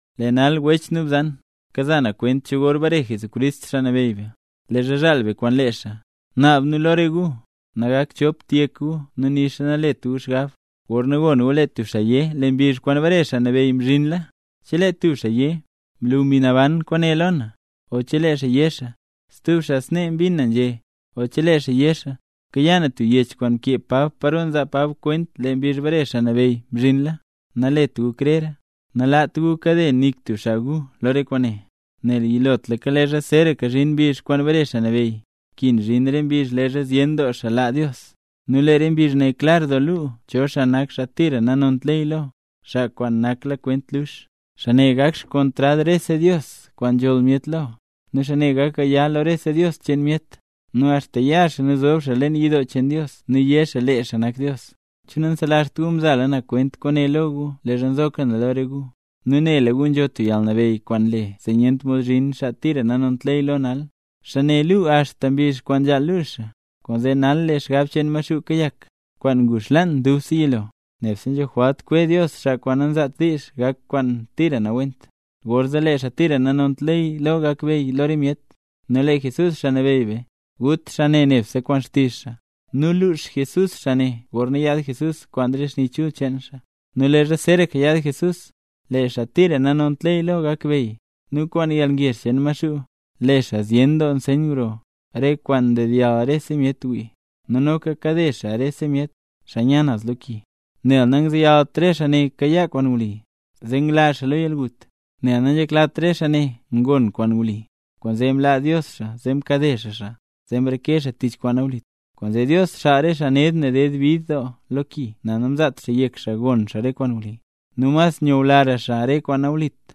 Lee nal wech nu bzan, kaza na kwent cho gor bare Jesucrist, Xaa Nabeyy be, leezha zhaal be kwaan lee xaa. Naab nu lo re gu, nagakt chop yek gu nixa nalet gu xgab, gorna gon gu lee tub xaa yé: “Lee mbizh kwaan bare Xaa Nabeyy mzhinla”. Chelee tub xaa yé: “Mlu Mbi Naban kwaane lo na”, o chelee xaa yé xaa: “Stub xaa snee mbin na nzhé”, o chelee xaa yé xaa: “Mkayaa na tub yech kwaan mkee Pab paro nzaa Pab kwent lee mbizh bare Xaa Nabeyy mzhinla”, nalet gu krera. Nalaat gu kade nik tub xaa gu lo re kwaane. Nel yilotlaka leezha zeeraka zhin mbizh kwaan bare Xaa Nabeyy, nkin zhin re mbizh leezha zyen doo xaa laa Dios. Nu lee re mbizh ne klar doo luu cho nak xaa tira nanont ley lo, xaa kwaan nakla kwent lux. Xaa ne gak xkontrad rese dios kwaan nzholl myet lo, nu xaa ne gak gaya lo rese dios cheen myet. Nu axta ya xaa nu zob xaa leen yidoo cheen Dios nu yé xaa lee xaa nak Dios. ¿Che nanselazht gu mzala na kwent kwaane lo gu leezha nzoka na lo re gu? Nu nela gu nzho tub yalnabeyy kwaan nle zee nyent mod zhin xaa tira nanont ley lo nal, xaa ne luu axta mbizh kwaan nzhaal luu xaa. Kwaanzee nal lee xgab cheen Maxuu kayak, kwaan ngu xlaan dubse yilo. Nebse nzho jwalt kwe Dios xaa kwaan nanzaat diizh gak kwaan tira nawent. Gorzee lee xaa tira nanont ley lo gakbeyy lo re myet. Nu lee Jesús, Xaa Nabeyy be, gut xaa ne nebse kwaan xtizh xaa, nu lux Jesús xaa ne gorna yaad Jesús kwaan re xni chul cheen xaa. Nu leezha zeeraka yaad Jesucrist, lee xaa tira nanont ley lo gakbeyy, nu kwaan yalngezh cheen Maxuu, le xaa zyen doo nseyn gro, re kwaan dedyall rese myet wii. Nu noka kade xaa ne rese myet, xaa nya naz lo ki; nel nangzeyalt re xaa ne kayaa kwaan wli, zee ngla xaa lo yalgut. Nel nanzheklat re xaa ne ngon kwaan wli, kwaanzee mlaa Dios xaa zee mkade xaa xaa, zee mreke xaa tich kwaan nawlit. Kwaanzee Dios xaal re xaa ned ne ded bid doo lo ki nel namzaat xaa yek xaa gon xaa re kwaan wli, nu mas nyulara xaa re kwaan nanalit.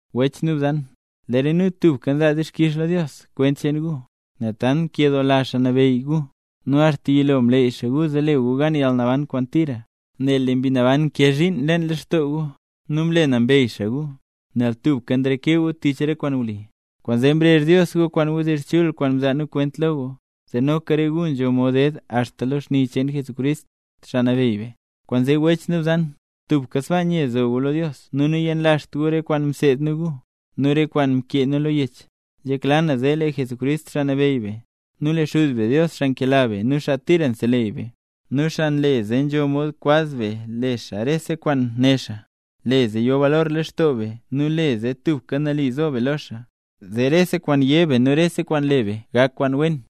Wech nu bzan, lee re nu tubka nzaa dixkix lo Dios kwent cheen gu, nel tant nkedoola Xaa Nabeyy gu. Nu axta yilo mleey xaa gu zee le gu gan yalnaban kwaan tira, nel lee Mbi Naban nkee zhiin leen lextoo gu, nu mle nambey xaa gu, nel tubka nreke gu tich re kwaan wli. Kwaanzee mrezh Dios gu kwaan wdizh chul kwaan mzaa nu kwent lo gu, zee noka re gu nzho mod ded axta lo xni cheen Jesucrist, Xaa Nabeyy be. Kwaanzee wech nu bzan, tubka sbaa nye zo gu lo Dios nu nayenlazht gu re kwaan mseed nu gu, nu re kwaan mkee nu lo yech. Nzhekla na zee lee Jesucrist, Xaa Nabeyy be, nu lee Xuz be Dios xaa nkela be nu xaa tira nseleyy be, nu xaa nle zee nzho mod kwaz be le xaa rese kwaan né xaa, le zee yo balor lextoo be nu le zee tubka nali zo be lo xaa, zee rese kwaan yé be nu rese kwaan le be gak kwaan wen.